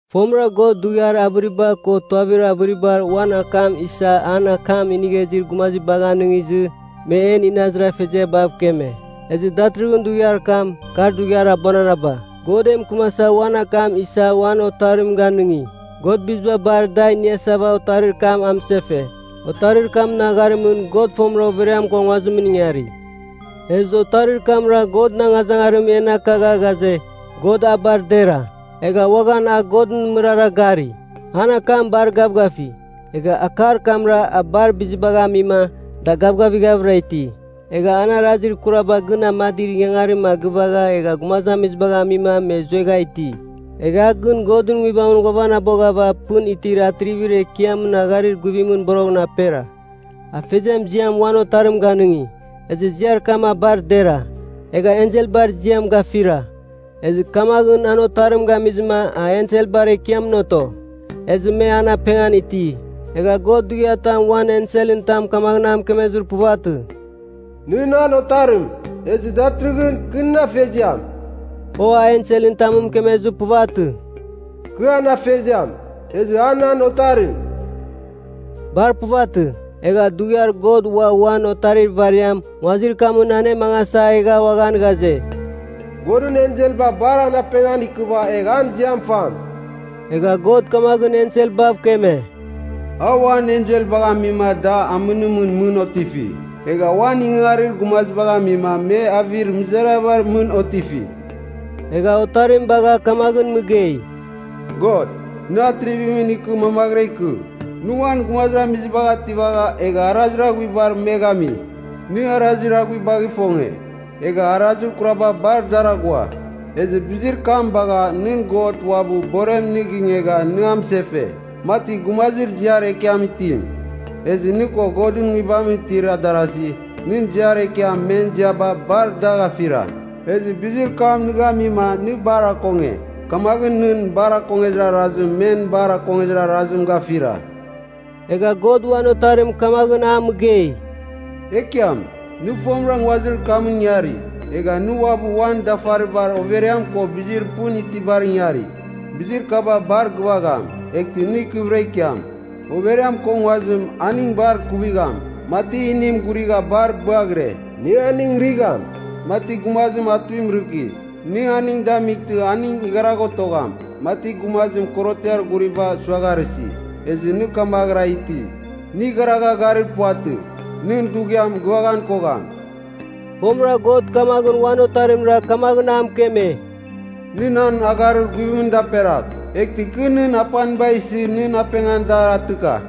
Fomɨra God dughiar avɨriba ko tuavir avɨribar uan akam isa an akam inigha izir gumazibagh anɨngizɨ, me en inazir afeziabav keme. Ezɨ datɨrɨghɨn dughiar kam, kar dughiar abuananaba, God e mɨkɨmasa uan akam isa uan Otarim ganɨngi. God biziba bar da iniasava Otarir kam a mɨsefe. Otarir kamɨn agharimɨn, God fomɨra overiam ko nguazimɨn ingari. Ezɨ Otarir kamra Godɨn angazangarim en akagha ghaze, God a bar dera. Egha uaghan a Godɨn mɨrara gari. An akam bar gavgafi, egha akar kamra a bar bizibagh amima, da gavgavighavɨra iti. Egha an arazir kuraba gɨn amadir ingangarim a gɨvagha, egha gumazamizibagh amima me zuegha iti. Egha a gɨn Godɨn Nguibamɨn ghuavanaboghava Pɨn Tir Atrivir Ekiamɨn agharir guvimɨn boroghɨn apera. Afeziam ziam uan Otarim ganɨngi. Ezɨ ziar kam a bar dera, egha enselbar ziam gafira. Ezɨ kamaghɨn an Otarim gamizɨma a enselbar ekiamɨn oto, ezɨ me an apengan iti. Egha God dughiatam uan enselɨn tam kamaghɨn a mɨkemezir puvatɨ, “Nɨ nan Otarim, ezɨ datɨrɨghɨn kɨ nɨn Afeziam.” O a enselɨn tamɨn mɨkemezir puvatɨ, “Kɨ an Afeziam, ezɨ a nan Otarim.” Bar puvatɨ. Egha dughiar God ua uan Otarir ivariam nguazir kamɨn anemangasa egha uaghan ghaze, “Godɨn enselba bar an apengan ikɨva egh an ziam fam.” Egha God kamaghɨn enselbav keme, “A uan enselbagh amima da amɨnimɨn mɨn otifi, egha uan ingangarir gumazibagh amima me avir mɨzariabar mɨn otifi.” Egha Otarim bagha kamaghɨn mɨgei, “God, nɨ Atrivimɨn ikɨ mamaghɨra ikɨ! Nɨ uan gumazamizibagh ativagha egha arazir aghuibar me gami. Nɨ arazir aghuibagh ifonge, egha arazir kuraba bar dar aghua. Ezɨ bizir kam bagha, nɨn God uabɨ, borem nɨ gingegha nɨ amɨsefe, mati gumazir ziar ekiam itim. Ezɨ nɨ ko Godɨn Nguibamɨn itir darasi, nɨn ziar ekiam men ziaba bar dagh afira. Ezɨ bizir kam nɨ gamima nɨ bar akonge. Kamaghɨn nɨn bar akongezir arazim men bar akongezir arazim gafira.” Egha God uan Otarim kamaghɨn a mɨgei, “Ekiam, nɨ fomɨra nguazir kamɨn ingari. Egha nɨ uabɨ uan dafaribar overiam ko bizir pɨn itibar ingari. Bizir kaba bar gɨvagham, eghtɨ nɨ ikɨvɨra ikiam. Overiam ko nguazim, aning bar kuvigham, mati inim ghurigha bar bɨaghire. Nɨ aning righam, mati gumazim atuim rɨki. Nɨ aning damightɨ aning igharagh otogham, mati gumazim korotiar ghuriba suagharɨsi. Ezɨ nɨ, kamaghɨra iti, nɨ igharagha garir puvatɨ. Nɨn dughiam gɨvaghan kogham.” Fomɨra God kamaghɨn uan Otarimra kamaghɨn a mɨkeme, “Nɨ nan agharir guvimɨn daperagh, eghtɨ kɨ nɨn apaniba isɨ nɨn apengan dar atɨka.”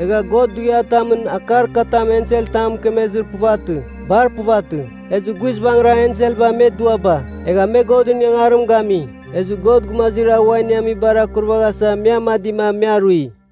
Egha God dughiatamɨn akar katam enselɨn tam mɨkemezir puvatɨ. Bar puvatɨ. Ezɨ guizbangɨra enselba me duaba, egha me Godɨn ingangarim gami. Ezɨ God gumazir a ua iniamibar akurvaghasa me amadima, me arui.